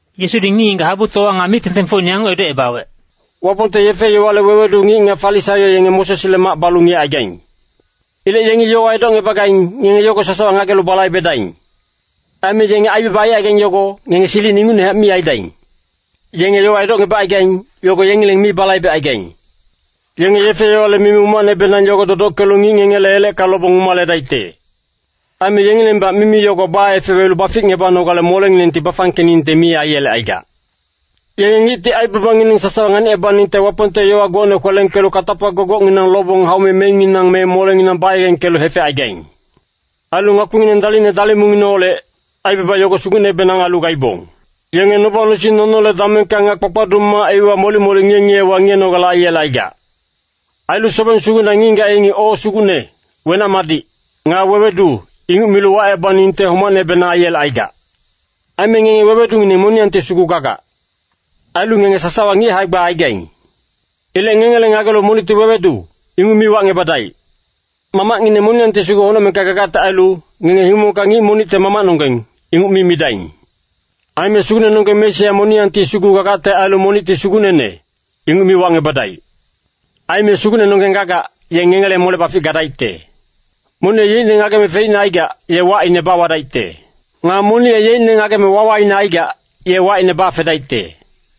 Yesudi ngic-ngigac habutowa nga mic-tengtengfocine yanguc edocebawec, “Wapongte yefe-yowale wewedu ngic nga Farisaio yenge Mosesle mac balu ngiyecaigaing. Ilec yengi yowa edocngebagaing, ngenge yogo sasawa ngagelu balaibedaing. Aime yenge aibaba aicaigaing yogo, ngenge silic ingucnehac mi aidaing. Yenge yowa edocngebacaigaing, yogo yengileng mi balaibecaigaing. Yenge yefe-yowale mimi umacnebenang yogo dodockelu ngic ngengele elecka lobong umaledaicte. Aime yengilengbac mimi yogo baefewelu baficngebanogale molenginengti bafangkeningte mi aiyelecaigac. “Yenge ngicti aibabangineng sasawa nganicebaningte Wapongte yowa gocne kwelengkelu katapa gogocnginang lobong haume meinginang me molenginang bayegengkelu hefecaigaing. Ailu ngakpingineng dalicne dalimungineholec, aibaba yogo sugucnebenang ailu gaibong. Yenge noba-nosing nonole damengka nga kpakpaduc mac iwa molic-molic ngiye-ngiyewa ngiyenogale aiyelecaigac. Ailu sobeng sugucna ngic-ngigac yengi ‘O Sugucne, wenac-madic,’ nga ‘Wewedu,’ inguc milu wacebaningte homacnebenang aiyelecaigac. “Aime ngenge wewedungineng moniyangti sugu gagac. Ailu ngenge sasawa ngic hae-gba aigaing. Ilec ngengele ngagelu monicti ‘Wewedu,’ inguc mi wacngebadaic. Mamacngineng moniyangti sugu honocmengka gagacte ailu, ngenge himongka ngic monicte ‘Mamacnonggeng,’ inguc mi midaing. Aime sugucnenonggeng Mesia moniyangti sugu gagacte ailu monicti ‘Sugucnene,’ inguc mi wacngebadaic. Aime sugucnenonggeng gagac, ye ngengele mole-bafic gadaicte. Monic ye yeicne ngageme feicne aicaigac, ye wacine bawadaicte. Nga monic ye yeicne ngageme wawaine aicaigac, ye wacine bafedaicte.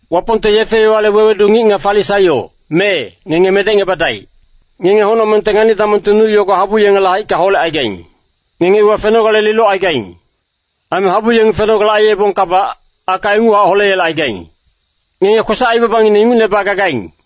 “Wapongte yefe-yowale wewedu ngic nga Farisaio, mee, ngenge medecngebadaic. Ngenge honocmengte ngani-damongte nu yogo habu yengele haicka holecaigaing. Ngenge iwa fenogale lilocaigaing. Aime habu yengi fenogale aiyebongkabac, aka inguchac holeyelecaigaing. Ngenge kwesac-aibabangineng ingucne bagagaing.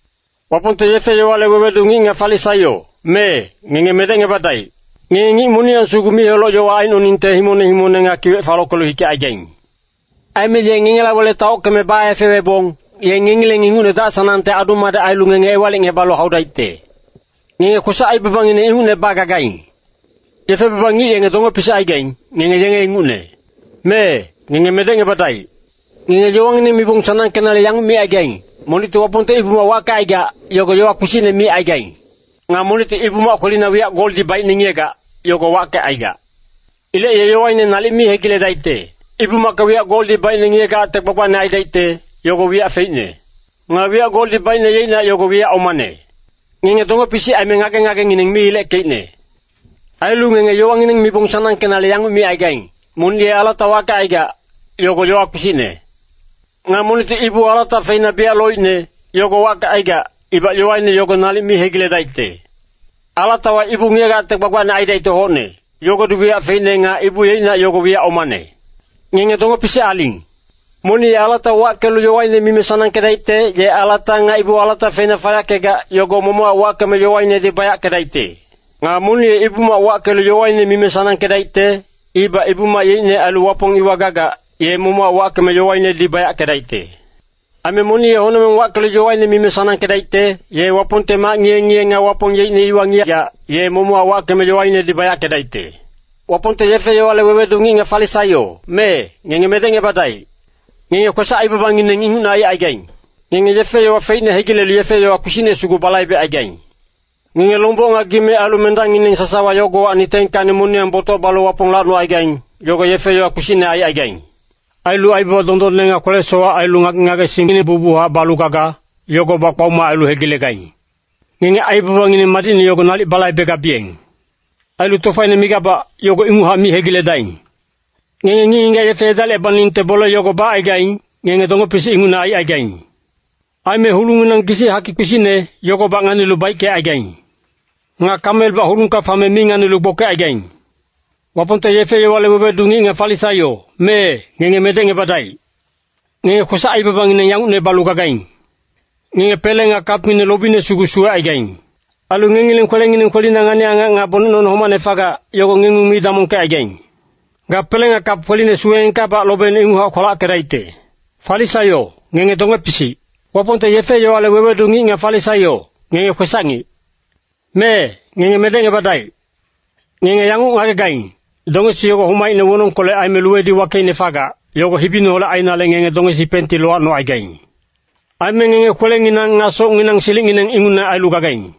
“Wapongte yefe-yowale wewedu ngic nga Farisaio, mee, ngenge medecngebadaic. Ngenge ngic moniyang sugu mic-heloc yowa aicnoningte himongne himongne nga kiwec falockelu hikecaigaing. Aime ye ngengela wele taockeme baefewebong, ye ngengileng ingucne dac-sanangte adu-madec ailu ngenge ewalicngebalu haudaicte. Ngenge kwesac-aibabangineng ingucne bagagaing. “Yefe baba ngic yenge donge-pisic aigaing, ngenge yenge ingucne. Mee, ngenge medecngebadaic. Ngenge yowangineng mibong sanangkenale yanguc micaigaing, ‘Monicti Wapongte Ibu-mac wackecaigac, yogo yowa kpisicne micaigaing. Nga monicti Ibu-mac kwelina wiyac goldi baicne ngiyegac, yogo wackecaigac. Ilec ye yowaine nalic mi hegiledaicte.’ Ibu-macka wiyac goldi baicne ngiyegacte gbagbacne aidaicte, yogo wiyac feicne. Nga wiyac goldi baicne yeicnac yogo wiyac omane. Ngenge donge-pisic aime ngage-ngagengineng mi ileckeicne. Ailu ngenge yowangineng mibong sanangkenale yanguc micaigaing, ‘Monic ye alata wackecaigac, yogo yowa kpisicne. Nga monicti ibu alata feina biyac loicne, yogo wackecaigac, ibac yowaine yogo nalic mi hegiledaicte.’ Alatawa ibu ngiyegacte gbagbacne aidaicte hocne, yogodi wiyac feicne nga ibu yeicnac yogo wiyac omane. Ngenge donge-pisic aling. “Monic ye alata wackelu yowaine mime sanangkedaicte, ye alata nga ibu alata feina fayackegac, yogo momochac wackeme yowainedi bayackedaicte. Nga monic ye Ibu-mac wackelu yowaine mime sanangkedaicte, ibac Ibu-mac yeicne ailu Wapong iwa gagac, ye momochac wackeme yowainedi bayackedaicte. Aime monic ye honocmeng wackelu yowaine mime sanangkedaicte, ye Wapongte mac ngiye-ngiye nga Wapong yeicne iwa ngiyegac, ye momochac wackeme yowainedi bayackedaicte. “Wapongte yefe-yowale wewedu ngic nga Farisaio, mee, ngenge medecngebadaic. Ngenge kwesac-aibabangineng ingucne aicaigaing. Ngenge yefe-yowa feicne hegilelu yefe-yowa kpisicne sugu balaibecaigaing. Ngenge lomboc nga gime ailu mendangngineng sasawa yogowacni 10kacni moniyang botoc balu Wapong lacnocaigaing, yogo yefe-yowa kpisicne aicaigaing. Ailu aibaba dondonne nga kwele-sowac ailu ngage-ngagesingngineng bucbuchac balu gaga, yogobac kpaoma ailu hegilegaing. Ngenge aibabangineng madicne yogo nalic balaibegabiyeng. Ailu tofaine migabac, yogo inguchac mi hegiledaing. Ngenge ngic-ngigac yefe edalicebaningte bole yogo bacaigaing, ngenge donge-pisic ingucne aicaigaing. Aime hulungnginang gisic hakic kpisicne, yogobac nganilu baickecaigaing. Nga kamelbac hulungka fame mi nganilu gbokecaigaing. “Wapongte yefe-yowale wewedu ngic nga Farisaio, mee, ngenge medecngebadaic. Ngenge kwesac-aibabangineng yangucne balu gagaing. Ngenge pele nga kapngineng lobine sugu suwecaigaing. Ailu ngengileng kwelengineng kwelina ngani-angac nga bonec nono homacne fagac, yogo ngengung mi damongkecaigaing. Ga pele nga kap kweline suweengkabac lobeine ingucnehac kwalackedaicte. Farisaio, ngenge donge-pisic. “Wapongte yefe-yowale wewedu ngic nga Farisaio, ngenge kwesac-ngic! Mee, ngenge medecngebadaic. Ngenge yanguc ngagegaing, dongesi yogo homaicne wonongkolec aime luwedi wakeicne fagac, yogo hibineholec ainale ngenge dongesi penti lowacnocaigaing. Aime ngenge kwelenginang nga socnginang silicngineng ingucne ailu gagaing.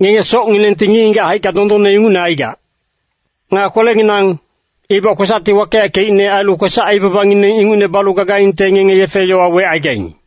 Ngenge socnginengti ngic-ngigac haicka dondonne ingucne aigac. Nga kwelenginang, ibac kwesacti wakeyackeicne ailu kwesac-aibabangineng ingucne balu gagaingte ngenge yefe-yowa wecaigaing.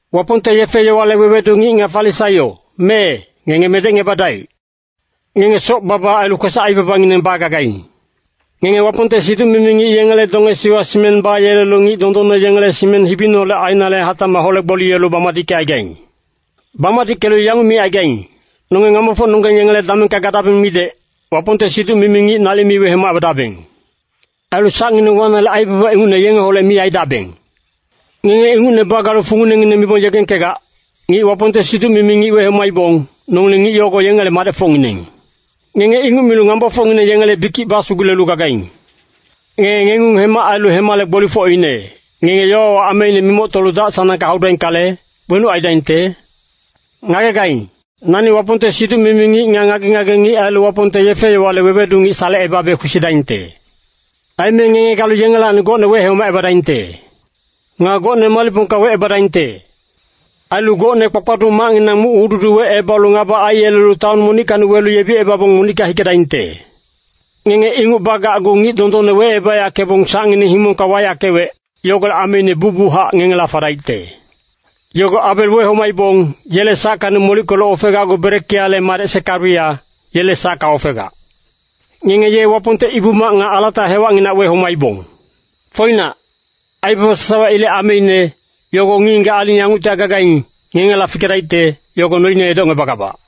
“Wapongte yefe-yowale wewedu ngic nga Farisaio, mee, ngenge medecngebadaic. Ngenge soc-baba ailu kwesac-aibabangineng bagagaing. Ngenge Wapongte siduc-mimi ngic yengele dongesiwa simeng bayelelu ngic dondonne yengele simeng hibineholec ainale hatacmac hole-gboliyelu bamadickecaigaing. Bamadickelu yanguc micaigaing, ‘Nonge ngambofocnonggeng yengele damengka gadabeng midec, Wapongte siduc-mimi ngic nalic mi wehomacebadabeng. Ailu sacngineng wanale aibaba ingucne yengeholec mi aidabeng.’ Ngenge ingucne bagalu funginengineng mibong yegengkegac, ‘Ngic Wapongte siduc-mimi ngic wehomacebaibong, nongileng ngic yogo yengele madecfocngineng.’ Ngenge inguc milu ngambofocngineng yengele bikic basugulelu gagaing. “Ngenge ngengung hema ailu hemale gbolifocine, ngenge yowawa ameine mimoctolu dac-sanangka haudaingkale, wenuc aidaingte? Ngagegaing, nani Wapongte siduc-mimi ngic nga ngage-ngage ngic ailu Wapongte yefe-yowale wewedu ngic salecebabe kwesidaingte. Aime ngenge galu yengelacni gocne wehomacebadaingte. Nga gocne malicpongka wecebadaingte. Ailu gocne kpakpaduc macnginang muc-hududi wecebalu ngaba aiyelelu taon monickacni welu yebicebabong monicka hikedaingte. Ngenge inguc bagacgu ngic dondonne wecebayackebong sacngineng himongka wayackewec, yogolec ameine bucbuchac ngengela fadaicte. Yogo Abel wehomaibong, yele sackacni molickelu ofegacgu Berekiale madec Sekariya, yele sacka ofegac. Ngenge ye Wapongte Ibu-mac nga alata hewacnginac wehomaibong. Foinac, aibaba sasawa ilec ameine, yogo ngic-ngigac aling yanguctihac gagaing, ngengela fikedaicte, yogo noine edocngebagabac.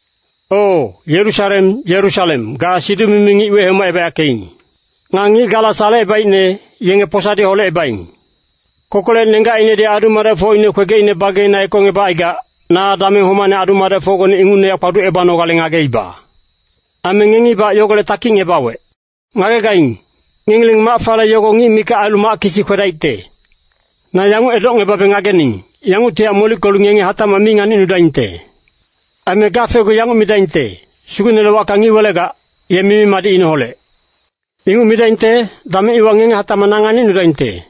“O, Yerusalem, Yerusalem, ga siduc-mimi ngic wehomacebayackeing. Nga ngic gala salecebaicne, yenge posadi holecebaing. Kokolec nenggacinedi adu-madecfocine kwegecine bageina ekongebacaigac, na dameng homacne adu-madecfocgone ingucnehac kpaducebanogale ngageiba. Aime ngengibac yogolec takicngebawec. Ngagegaing, ngengileng mac fale yogo ngic mikac ailu mac kisi kwedaicte. Na yanguc edocngebabe ngagening, yanguctihac molickelu ngenge hatacmac mi nganicnudaingte. Aime gafecgu yanguc midaingte, ‘Sugucnele wacka ngic welegac, ye mimi-madicineholec.’ Inguc midaingte, dameng iwa ngenge hatacmac nganicnudaingte.”